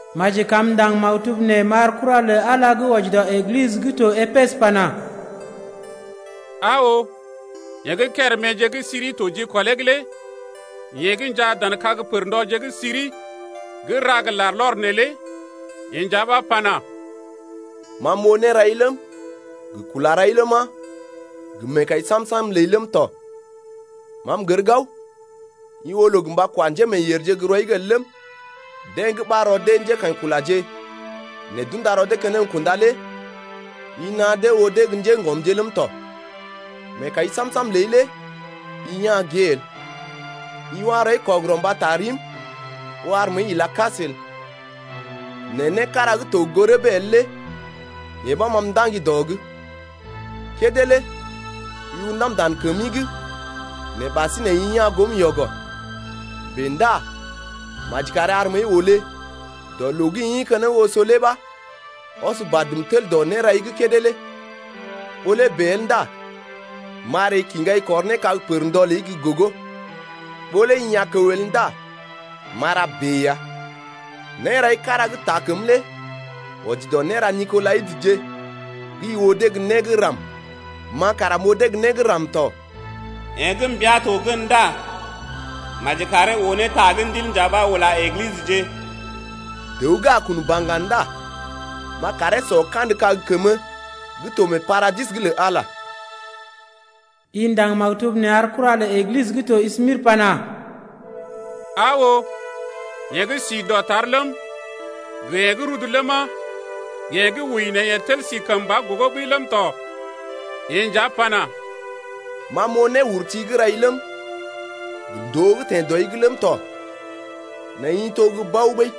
Maji kam m’ndaŋg maktub nee m’ar kura lə Ala gə́ wɔji dɔ Eglisə gə́ to Epesə pana: Aa oo, yeḛ gə́ kéréméje gə́ siri to jikɔlee’g lé yeḛ gə́ njaa dan kag pərndɔje gə́ siri gə́ ra gə larlɔr neelé yeḛ nja ɓa pana: Ma m’oo nérai ləm, gə kula rai ləma, gə meekai sam-sam ləi ləm tɔ. Ma m’gər gao i oo loo gə mba kwa njémeeyèrje gə́ rɔi’g el ləm, deḛ gə́ ɓar rɔ dee njékaḭkulaje nɛ d’unda rɔ dee keneŋ gə́ kunda lé i naa dee oo dee gə́ njéŋgɔmje ləm tɔ. Meekai sam-sam ləi lé i ya̰ gée el. I wa rɔi kɔgərɔ mbata rim ɓó ar məəi ila kas el. Nɛ né kára gə́ to gə goo rəbee el lé yee ɓa ma m’ndaŋgi dɔ’g. Kédé lé i undam dan kəmi’g nɛ ɓasinè i ya̰ goom yɔgɔ. Bèe ndá maji kari ar məəi olé dɔ loo gə́ i ḭ keneŋ oso lé ɓa ɔs badm tel dɔ nérai gə́ kédé lé, ɓó lé bèe el ndá m’a ree kiŋgai kɔr ne kag pərndɔ ləi gə́ gogo. Ɓó lé i a kəw el ndá m’a ra bèe ya. Nérai kára gə́ taa kəm lé wɔji dɔ néra Nikolaitəje gə́ i oo dee gə́ né gə́ ram, ma kara m’oo dee gə́ né gə́ ram tɔ. Yeḛ gə́ mbia to gən ndá maji karee oo ne ta gə́ Ndil nja ɓa ula Eglisəje. Dəw gə́ a kun baŋga ndá m’a karee sɔ kandə kag kəmə gə́ to mee paradis’g lə Ala lé ya. I ndaŋg maktub nee ar kura lə Eglisə gə́ to Smirnə pana: Aa oo, yeḛ gə́ si dɔtar ləm, gə yeḛ gə́ rudu ləma, gə yeḛ gə́ wəi nɛ yeḛ tel si kəmba gogo ɓəi ləm tɔ lé yeḛ nja pana: Ma m’oo néurti gə́ rai ləm, gə ndòo gə́ teḛ dɔi’g ləm tɔ, nɛ i to gə́ bao ɓəi.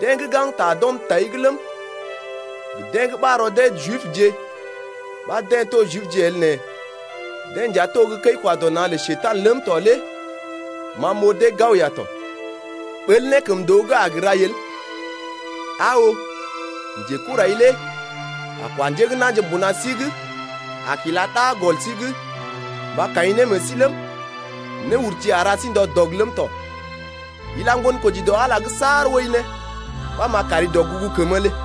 Deḛ gə́ gaŋgta d’ɔm tai’g ləm, gə deḛ gə́ ɓar rɔ dee Jibje ɓa deḛ to gə́ Jibje el nɛ deḛ nja to gə́ kəi-kwa-dɔ-na̰ lə Njekurai ləm to lé ma m’oo dee gao ya tɔ. Ɓəl nékəmndoo gə́ gə a rai el. Aa oo, njekurai lé a kwa njé gə́ na̰je mbuna sí’g a kila ɗa gɔl sí’g mba kaḭ ne meḛ sí ləm, néurti a ra sí ndɔ dɔg ləm tɔ. Ila ŋgonkoji dɔ Ala’g saar wəi ne, ɓa m’a kari dɔgugu kəmə lé.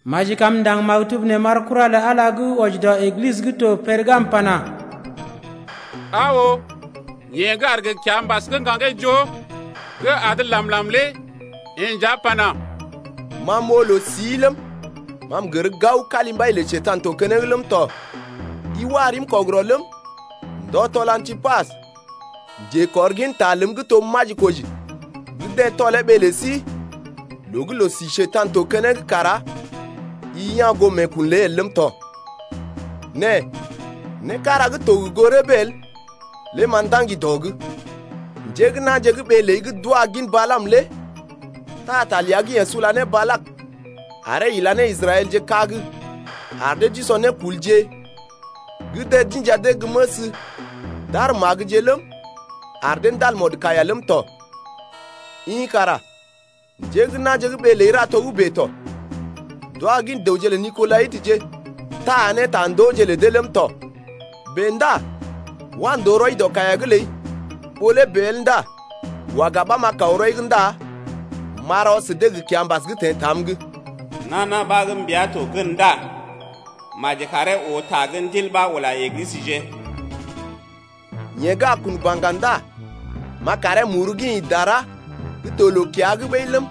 Maji kam m’ndaŋg maktub nee m’ar kura lə Ala gə́ wɔji dɔ Eglisə gə́ to Pergamə pana: Aa oo, yeḛ gə́ aar gə kiambas gə́ ŋgaŋgee joo gə́ adə làm-làm lé yeḛ nja pana: Ma m’oo loo-sii ləm, ma m’gər gao kalimbai lə Njekurai to keneŋ ləm tɔ. I wa rim kɔgərɔ ləm, ndɔ tɔl Antipas, njekɔrginta ləm gə́ to majikoji gə́ deḛ tɔlee ɓee lə sí loo gə́ loo-si Njekurai to keneŋ kara i ya̰ goo meekun ləi el ləm tɔ. Nɛ né kára gə́ to gə goo rəbee el lé ma m’ndaŋgi dɔ’g, njé gə́ na̰je gə́ ɓee ləi gə́ d’wa gin Balaam lé taa ta ləa gə́ yeḛ sula ne Balak, aree ila ne Israɛlje kag ar dee d’usɔ nékulje gə́ deḛ d’inja dee gə́ məs d’ar magəje ləm, ar dee ndal mɔdkaiya ləm tɔ. I kara njé gə́ na̰je gə́ ɓee ləi ra togə́bè tɔ, d’wa gin dəwje lə Nikolaitəje taa ne tandooje lə dee ləm tɔ. Bèe ndá wa ndòo rɔi dɔ kaiya’g ləi, ɓó lé bèe el ndá waga ɓa m’a kaw rɔi’g ndá m’a rɔ sə dee gə kiambas gə́ teḛ tam’g. Nana ɓa gə́ mbia to gən ndá maji karee oo ne ta gə́ Ndil ɓa ula Eglisəje: Yeḛ gə́ a kun baŋga ndá m’a karee muru gə́ ḭ dara gə́ to loo-kiya’g ɓəi ləm,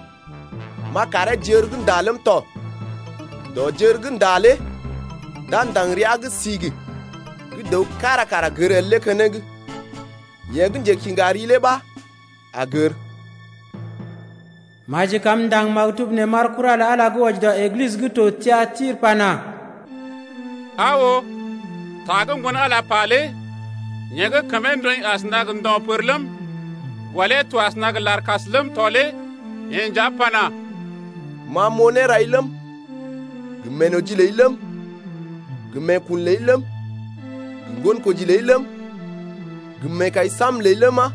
m’a karee j’ər gə́ nda ləm tɔ. Dɔ jər gə́ nda lé d’a ndaŋg ria gə́ sigi gə́ dəw kára kara gər el lé keneŋ, yeḛ gə́ njekiŋga ri lé ɓa a gər. Maji kam m’ndaŋg maktub nee m’ar kura lə Ala gə́ wɔji dɔ Eglisə gə́ to Tiatirə pana: Aa oo, ta gə́ Ŋgon-Ala pa lé yeḛ gə́ kəmee ndɔḭ asəna gə ndo̰ pər ləm, gɔlee to asəna gə larkas ləm tɔ lé yeḛ nja pana: Ma m’oo nérai ləm, gə meenoji ləi ləm, gə meekun ləi ləm, gə ŋgonkoji ləi ləm, gə meekai sam-sam ləi ləma,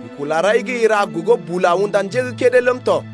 gə kula rai gə́ i ra gogo bula unda njé gə́ kédé ləm tɔ.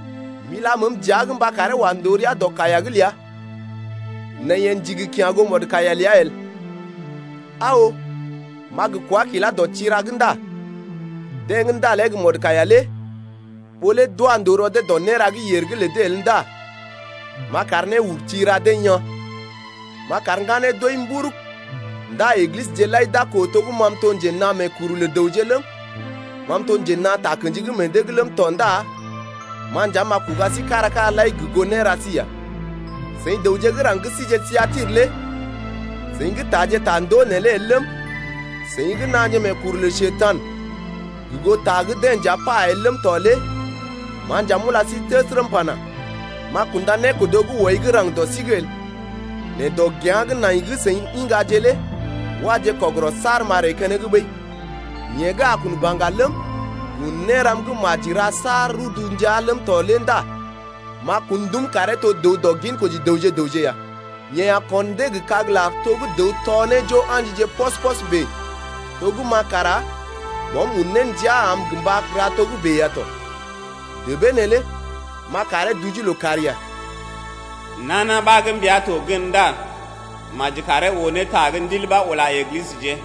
M’ila məəm dəa’g mba karee wa ndòo rəa dɔ kaiya’g ləa nɛ yeḛ ndigi kya̰ goo mɔdkaiya ləa el. Aa oo, m’a gə kwá kilá dɔ tira’g ndá deḛ gə́ ndalee gə mɔdkaiya lé ɓó lé d’wa ndòo rɔ dee dɔ néra gə́ yèr’g lə dee el ndá m’a kar néurti ra dee yaa̰. M’a kar ŋganee d’wəi mburug, ndá Eglisəje lai d’a koo to gə́ ma m’to nje naa meekuru lə dəwje ləm, ma m’to njenaa takə̰ji gə́ meḛ dee’g ləm tɔ ndá ma nja m’a kuga sí kára-kára lai gə goo néra sí ya. Seḭ dəwje gə́ raŋg gə́ sije Tiatirə lé seḭ gə́ taaje tandoo neelé el ləm, seḭ gə́ naaje meekuru lə Njekurai gə goo ta gə́ deḛ nja pa el ləm tɔ lé ma nja m’ula sí təsərə m’pana: M’a kunda nékodo gə́ wɔi gə́ raŋg dɔ sí’g el. Nɛ dɔgea̰ gə́ nai gə́ seḭ iŋgaje lé waje kɔgərɔ saar m’a ree keneŋ ɓəi. Yeḛ gə́ a kun baŋga ləm, gə́ un néram gə́ maji ra saar rudu ndəa ləm tɔ lé ndá m’a kun dum karee to dəw dɔ ginkoji dəwje gə raŋg ya. Yeḛ a kon dee gə kag-lar to gə́ dəw tɔ ne jo a̰jije pɔs-pɔs bèe to gə́ ma kara Bɔm un ndia am gə mba ra togə́bè ya tɔ. Débee neelé m’a karee duje lookàr ya. Nana ɓa gə́ mbia to gən ndá maji karee oo ne ta gə́ Ndil ɓa ula Eglisəje.